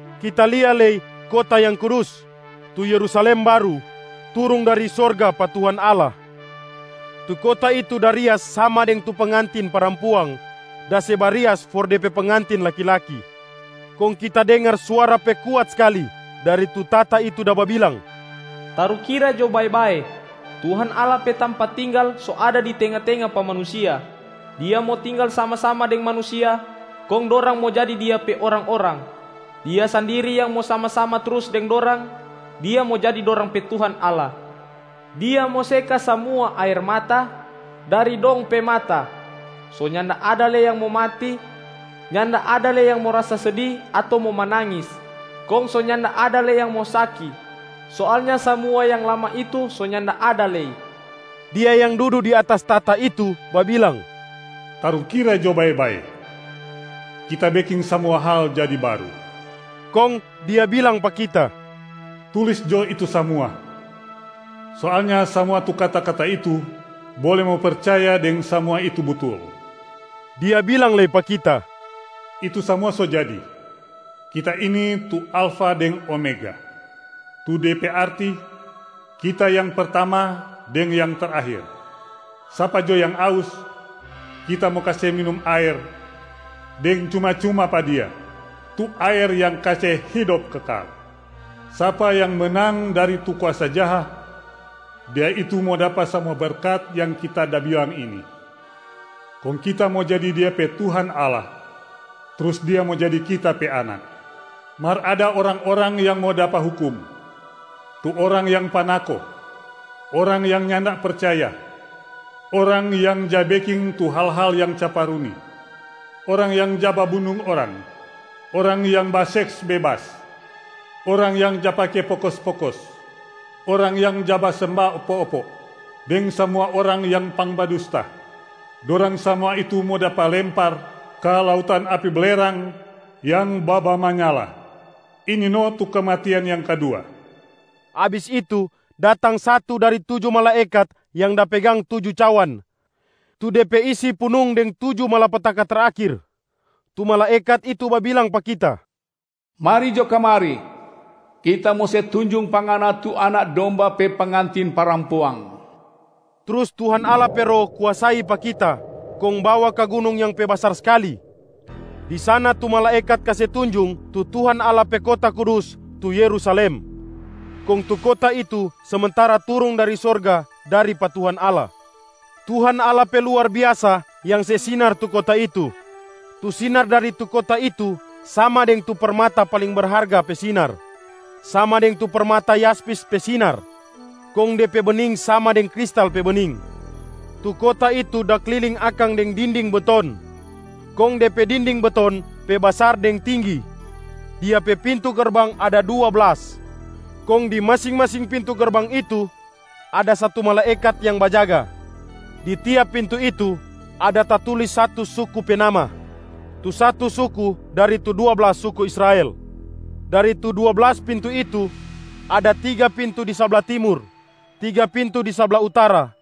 Kita lia lei kota yang kudus, tu Yerusalem baru, turung dari sorga dari pa Tuhan Allah. Tu kota itu da rias sama deng tu pengantin parampuang da se barias for de pe pengantin laki-laki. Kong kita dengar suara pe kuat skali dari tu tahta itu da babilang, “Tarukira jo bae-bae, Tuhan Allah pe tampa tinggala so ada di tenga-tenga pa manusia. Dia mo tinggal sama-sama deng manusia kong dorang mo jadi Dia pe orang-orang. Dia sandiri yang mo sama-sama trus deng dorang, Dia mo jadi dorang pe Tuhan Allah. Dia mo seka samua aer mata dari dong pe mata. So nyanda ada lei yang mo mati, nyanda ada lei yang mo rasa sedi ato mo manangis, kong so nyanda ada lei yang mo saki. Soalnya samua yang lama itu so nyanda ada lei.” Dia yang dudu di atas tahta itu babilang, “Tarukira jo bae-bae, Kita beking samua hal jadi baru!” Kong Dia bilang pa kita, “Tulis jo itu samua! Soalnya samua tu kata-kata itu bole mo percaya deng samua itu butul.” Dia bilang lei pa kita, “Itu samua so jadi. Kita ini tu Alfa deng Omega, tu de pe arti Kita Yang Pertama deng Yang Terakhir. Sapa jo yang aus, Kita mo kase minum aer deng cuma-cuma pa dia, tu aer yang kase hidop kekal. Sapa yang menang dari tu kuasa jaha, dia itu mo dapa samua berkat yang Kita da bilang ini. Kong Kita mo jadi dia pe Tuhan Allah, trus dia mo jadi Kita pe anak. Mar ada orang-orang yang mo dapa hukum: tu orang yang panako, orang yang nyanda percaya, orang yang ja beking tu hal-hal yang caparuni, orang yang ja babunung orang, orang yang baseks bebas, orang yang ja pake pokos-pokos, orang yang ja basemba opo-opo, deng samua orang yang pangbadusta, dorang samua itu mo dapa lempar ka lautan api belerang yang babamanyala. Ini no tu kematian yang kadua.” Abis itu, datang satu dari tuju malaekat yang da pegang tuju cawan tu de pe isi punung deng tuju malapetaka terakhir. Tu malaekat itu babilang pa kita, “Mari jo kamari! Kita mo se tunjung pa ngana tu Anak Domba pe pengantin parampuang.”b Trus Tuhan Allah pe Roh kuasai pa kita kong bawa ka gunung yang pe basar skali. Di sana tu malaekat kase tunjung tu Tuhan Allah pe kota kudus tu Yerusalem, kong tu kota itu samantara turung dari sorga dari pa Tuhan Allah. Tuhan Allah pe luar biasa yang se sinar tu kota itu. Tu sinar dari tu kota itu sama deng tu permata paling berharga pe sinar, sama deng tu permata yaspis pe sinar, kong de pe bening sama deng kristal pe bening. Tu kota itu da kliling akang deng dinding beton. Kong de pe dinding beton pe basar deng tinggi. Dia pe pintu gerbang ada dua blas, kong di masing-masing pintu gerbang itu ada satu malaekat yang bajaga. Di tiap pintu itu ada tatulis satu suku pe nama, tu satu suku dari tu dua blas suku Israel. Dari tu dua blas pintu itu, ada tiga pintu di sabla timur, tiga pintu di sabla utara,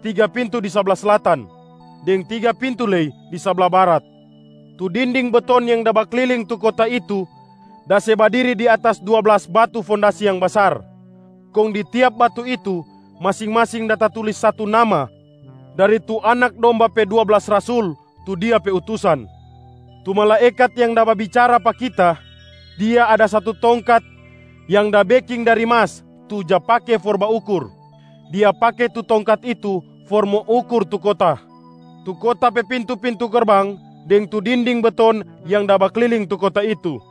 tiga pintu di sabla slatan, deng tiga pintu lei di sabla barat. Tu dinding beton yang da bakliling tu kota itu da se badiri di atas dua blas batu fondasi yang basar. Kong di tiap batu itu, masing-masing da tatulis satu nama dari tu Anak Domba pe dua blas rasul tu Dia pe utusan. Tu malaekat yang da babicara pa kita, dia ada satu tongkat yang da beking dari mas tu ja pake for baukur. Dia pake tu tongkat itu for mo ukur tu kota, tu kota pe pintu-pintu gerbang deng tu dinding beton yang da bakliling tu kota itu.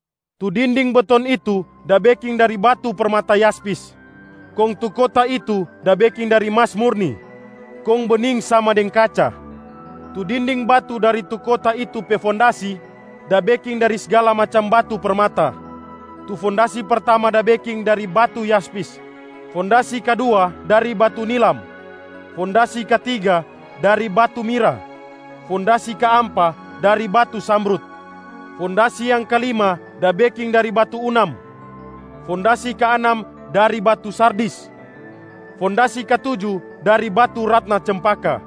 Tu dinding beton itu da beking dari batu permata yaspis. Kong tu kota itu da beking dari mas murni, kong bening sama deng kaca. Tu dinding batu dari tu kota itu pe fondasi da beking dari sgala macam batu permata. Tu fondasi pertama da beking dari batu yaspis, fondasi kadua dari batu nilam, fondasi katiga dari batu mirah, fondasi kaampa dari batu zamrud, fondasi yang kalima da beking dari batu unam, fondasi kaanam dari batu sardis, fondasi katuju dari batu ratna cempaka,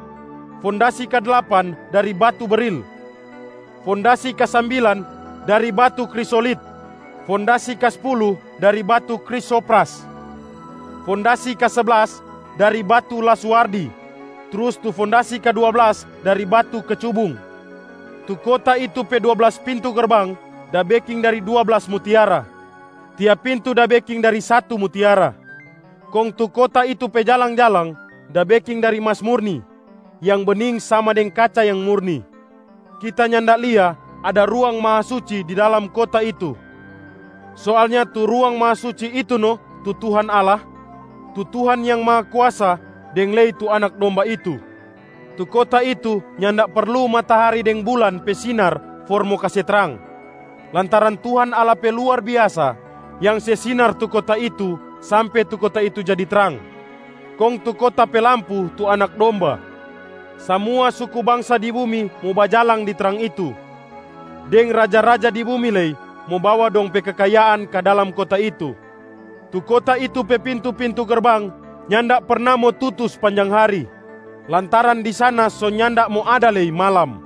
fondasi kadlapan dari batu beril, fondasi kasambilan dari batu krisolit, fondasi kaspulu dari batu krisopras, fondasi kaseblas dari batu lazuardi, trus tu fondasi kadua blas dari batu kecubung. Tu kota itu pe dua blas pintu gerbang da beking dari dua blas mutiara, tiap pintu da beking dari satu mutiara. Kong tu kota itu pe jalang-jalang da beking dari mas murni, yang bening sama deng kaca yang murni. Kita nyanda lia ada Ruang Mahasuci di dalam kota itu. Soalnya tu Ruang Mahasuci itu no tu Tuhan Allah, tu Tuhan Yang Mahakuasa deng lei tu Anak Domba itu. Tu kota itu nyanda perlu matahari deng bulan pe sinar for mo kase trang, lantaran Tuhan Allah pe luar biasa yang se sinar tu kota itu sampe tu kota itu jadi trang, kong tu kota pe lampu tu Anak Domba. Samua suku bangsa di bumi mo bajalang di trang itu, deng raja-raja di bumi lei mo bawa dong pe kekayaan ka dalam kota itu. Tu kota itu pe pintu-pintu gerbang nyanda perna mo tutu spanjang hari, lantaran di sana so nyanda mo ada lei malam.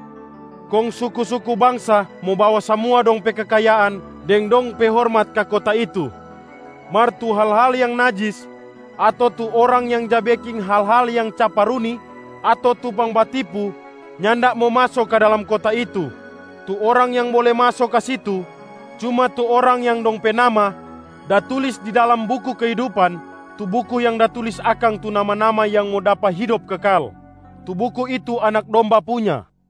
Kong suku-suku bangsa mo bawa samua dong pe kekayaan deng dong pe hormat ka kota itu. Mar tu hal-hal yang najis, ato tu orang yang ja beking hal-hal yang caparuni ato tu pangbatipu nyanda mo maso ka dalam kota itu. Tu orang yang bole maso ka situ, cuma tu orang yang dong pe nama da tulis di dalam buku kehidupan tu buku yang da tulis akang tu nama-nama yang mo dapa hidop kekal. Tu buku itu Anak Domba punya.